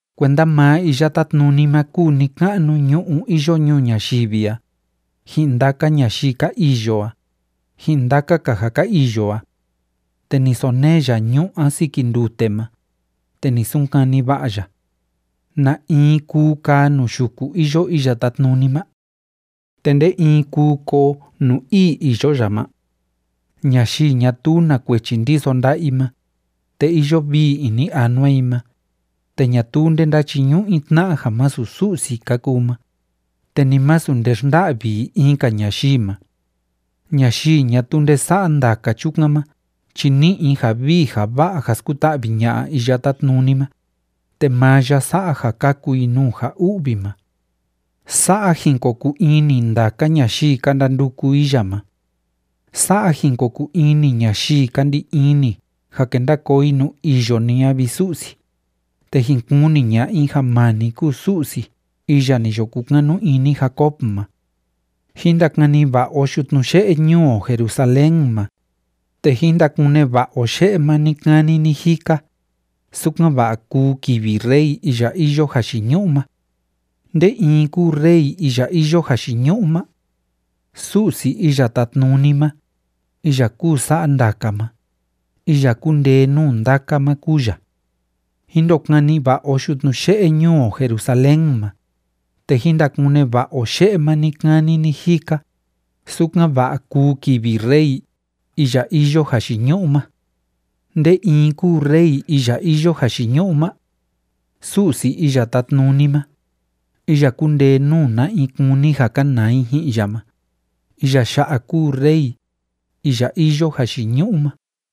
Kuenda maa Iya Tátnuni ma kúu ni‑ka'nu ñu'ú iyo ñuu ñayivi a, ji'in ndaka ñayii ka iyo a, ji'in ndaka‑ka ja ka iyo a. Te ni sonee ya ñu'ú a siki ndute ma, te ni sunkani va'a ya. ¿Na in kuu kaa nuu yuku iyo Iya Tátnuni ma? ¿Te nde in kuu koo nuu ii iyo ya ma? Ñayii ñatuu na kuechi ndiso nda'a i ma, te iyo vii ini anua i ma, te ñatuu nde ndáchiñu'u i tna'a ja masu Su'si ka kuu ma, te ni masu nde xnda'vi i in‑ka ñayii ma. Ñayii ñatuu nde sa'a ndaka chukan ma chi ni'i i ja vii ja va'a ja skuta'vi ña'a Iya Tátnuni ma, te maa ya sa'a ja kaku i nuu ja u'vi ma. Sa'a jin ko kuu ini ndaka ñayii ka ndanduku i ya ma. Sa'a jin ko kuu ini ñayii ka ndi ini ja kenda koo i nuu iyo ni a, vi Su'si, te jin kuni ña'a i ja maa ni kúu Su'si iya ni yo kukanu ini Jacob ma. Jín ndakani va'a o yutnu ye'e ñuu o Jerusalén ma, te jín ndakune va'a o ye'e ma ni‑kani ni‑jika, sukan‑va'a kuu kivi Rey iya iyo jayiñu'u ma. ¿Nde in kúu Rey iya iyo jayiñu'u ma? ¡Su'si Iya Tátnuni ma, iya kúu sa'a ndaka ma, iya kúndee nuu ndaka ma, kúu ya! Jín ndokani va'a o yutnu ye'e ñuu o Jerusalén ma, te jín ndakune va'a o ye'e ma ni‑kani ni‑jika, sukan‑va'a kuu kivi Rey, iya iyo jayiñu'u ma. ¿Nde in kúu Rey iya iyo jayiñu'u ma? ¡Su'si Iya Tátnuni ma, iya kúndee nuu na in kúni ja kanaa i ji'in ya ma, iya ya'a kúu Rey, iya iyo jayiñu'u ma!